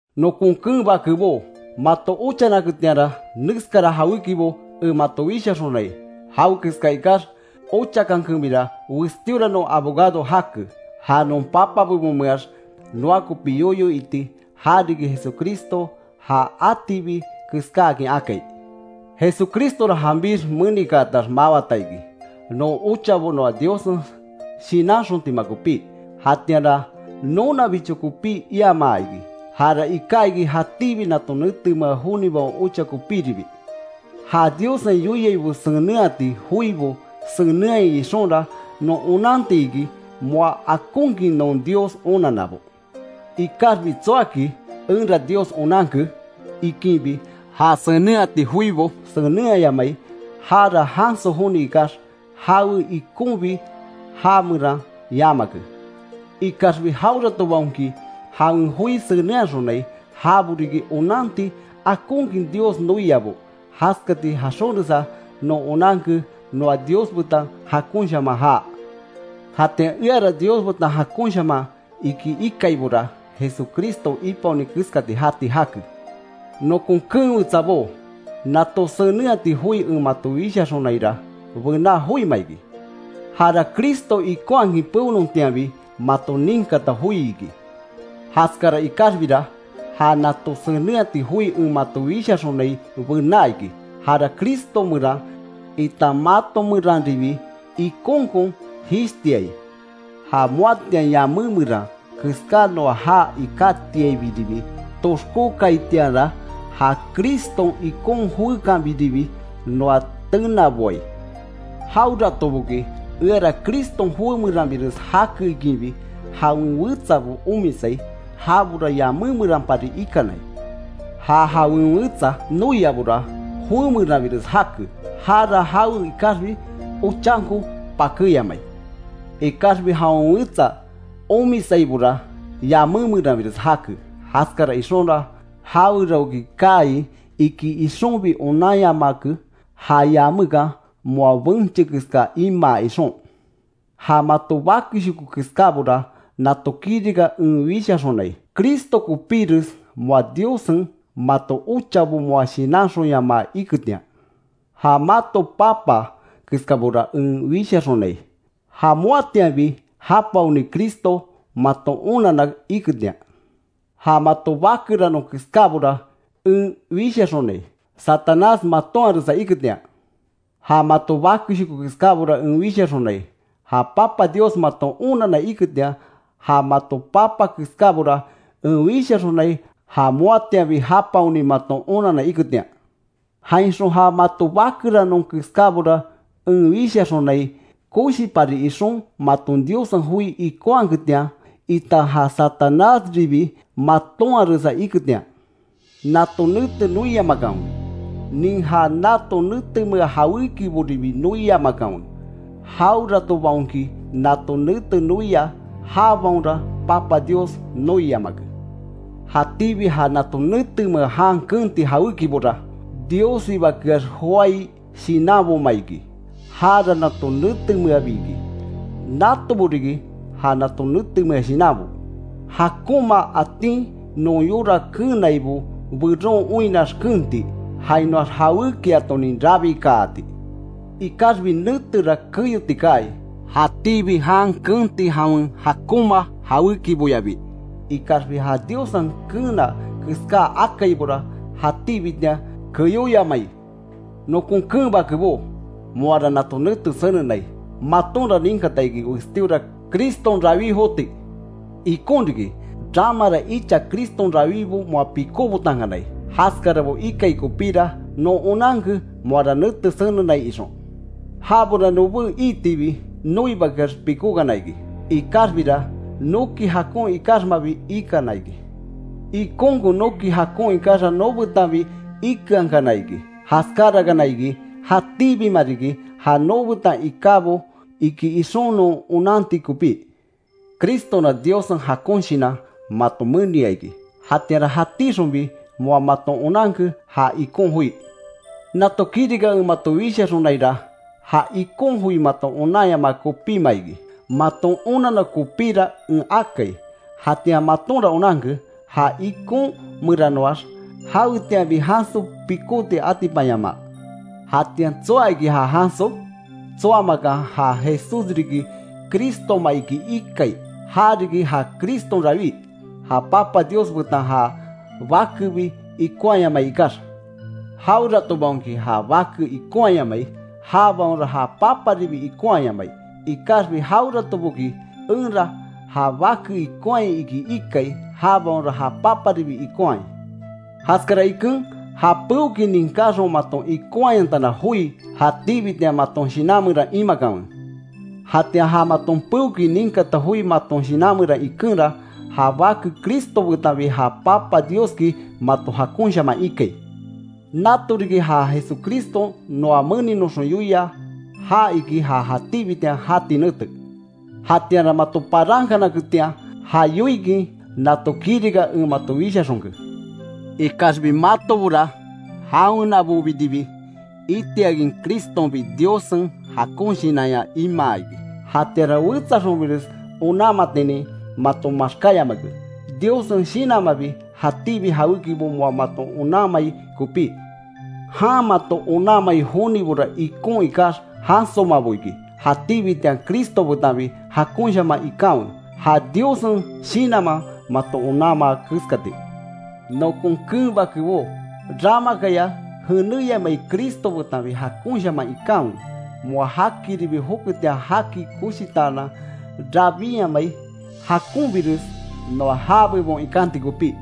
Nokon keen bakebó, mato ochanaketianra, neskara jawékibo en mato wishaxonai. Jawekeska ikax ochakankebira, westíora non abogado jake, ja non Papa bebonmeax, noa kopi yoyo iti, ja riki Jesucristo, ja atibi keskáakin akai. Jesucristora, janbix menikaatax mawata iki, non ochabo noa Diossen shinanxontima kopí. Jatianra nonabicho kopí iamaa iki, jara iká iki, jatíbi nato netemea jonibaon ocha kopíribi. Ja Diossen yoiai senenhati joibo senenhaai ixonra, non onanti iki, moa akonkin non Dios onannabo. Ikaxbi tsoaki: “Enra Dios onanke” ikinbi, ja senenhati joibo senenhayamai, jara janso joni ikax, jawe ikonbi já meran yamake. Ikaxbi jaweratobaonki jawen joi senenhaxonai, jabo riki onanti, akonkin Dios noiabo. Jaskati jaxonresa non onanke, noa Dios betan jakonshaman jaa. Jatian eara Dios betan jakonshaman iki ikaibora, Jesucristo ipaoni keskati jati jake. Nokon keen wetsabó, nato senenhati joi en mato wishaxonaira, bená joima iki. Jara Cristo ikonhakin peonontianbi maton ninkata joi iki. Jaskara ikaxbira, ja nato senenhati joi en mato wishaxonai bená iki. Jara Cristo meran, itan mato meranribi ikonkon jishtiai. Ja moatian yamé meran keská noa jaa ikátiaibiribi toxkókaitianra, ja Criston ikon joékanbiribi noa tenaboai. Jaweratoboki eara Criston joé meranbires jake ikinbi, jawen wetsabo omisai, jabora yamé meranpari ikanai. Ja jawen wetsa noiabora, joé meranbires jake. Jara jawe ikaxbi ochanko pakéyamai. Ikaxbi jawen wetsa omisaibora, yamé meranbires jake, jaskara ixonra jaweraoki kaai iki ixonbi onanyamake, ja yamekan moa benche keska imaa ixon. Ja mato bakeshoko keskábora, nato kirika en wishaxonai, Cristo kopíres moa Diossen maton ochabo moa shinanxonyamaa iketian. Ja mato papa keskabora en wishaxonai, ja moatianbi japaoni Cristo maton onanna iketian. Ja mato bakeranon keskábora en wishaxonai, Satanás matonharesa iketian. Ja mato bakeshoko keskábora en wishaxonai, ja Papa Dios maton onanna iketian. Ja mato papa keskábora en wishaxonai, ja moatianbi japaoni maton onanna iketian. Jainxon ja mato bakeranon keskábora en wishaxonai, koshipari ixon, maton Diossen joi ikonhaketian, itan ja Satanásribi matonharesa iketian. Nato nete noiyamakanwe, nin ja nato netemea jawékiboribi noiyamakanwe. Jaweratobaonki nato nete noia, jabaonra Papa Dios noiyamake. Jatíbi ja nato netemea jan keenti jawékibora Diossibakeax joái shinanboma iki, jara nato netemeabi iki. Natobo riki, ja nato netemea shinanbo: jakonma atin non yora keenaibo, beron oinnax keenti, jainoax jawékiatonin rabikaati. Ikaxbi netera keyoti kaai, jatíbi jan keenti jawen jakonma jawékiboyabi. Ikaxbi ja Diossen keena keská akaibora, jatíbitian keyóyamai. Nokon keen bakebó, moara nato nete senenai, matonra ninkata iki westíora Criston rawí joti. Ikon riki, ramara icha Criston rawibo moa pikóbotankanai. Jaskarabo ikai kopíra, non onanke, moara nete senenai ixon. Jabora nobé iitibi, noibakeax pikókana iki. Ikaxbira, noki jakon ikaxmabi ikana iki. Ikonkon noki jakon ikaxa nobetanbi ikeankana iki. Jaskárakana iki, jatíbima riki ja nobetan ikábo iki ixon non onanti kopí. Cristonra Diossen jakon Shinan mato menia iki. Jatianra jatixonbi moa maton onanke, ja ikon joi. Nato kirika en mato wishaxonaira, ja ikon joi maton onanyamaa kopíma iki. Maton onanna kopíra en akai. Jatian matonra onanke, ja ikon meranoax jawetianbi janso pikóti atipanyamaa. Jatian ¿Tsoa iki ja janso? Tsoamakan ja Jesús riki, Cristoma iki ikai. Já riki ja Criston rawí, ja Papa Dios betan ja Bakebi ikonhayamai ikax. Jaweratobaonki, ja Bake ikonhayamai jabaonra ja Paparibi ikonhayamai. Ikaxbi jaweratoboki, enra ja Bake ikonhai iki ikai, jabaonra ja Paparibi ikonhai. Jaskara iken, ja peokin ninkáxon maton ikonhayantana joi, jatíbitian maton shinan meran imakanwe. Jatian ja maton peokin ninkata joi maton shinan meran ikenra, ja Bake Cristo betanbi ja Papa Dioski mato jakonshaman ikai. Nato riki, ja Jesucriston noa meninoxon yoia, ja iki ja jatíbitian jati nete. Jatianra mato parankanaketian, ja yoikin nato kirika en mato wishaxonke. Ikaxbi matobora, jawenabobiribi itiakin, Cristonbi Diossen jakon Shinanya imaa iki, jatianra wetsaxonbires onanmatin mato maxkáyamake, Diossen Shinanmanbi jatíbi jawékibo moa mato onanmai kopí. Jan mato onanmai joibora ikon ikax, jansomabo iki. Jatíbitian Cristo betanbi jakonshaman ikanwe, ja Diossen Shinanman mato onanmaa keskati. Nokon keen bakebó, ramakaya jenéyamai Cristo betan jakonshaman ikanwe. Moa jakiribi joketian, jaki koshitaanan rabinyamai jakonbires noa já bebon ikanti kopí.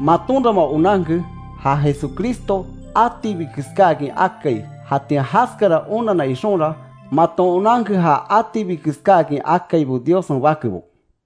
Matonra moa onanke, ja Jesucristo atibi keskáakin akai. Jatian jaskara onanna ixonra, maton onanke ja atibi keskáakin akaibo, Diossen bakebo.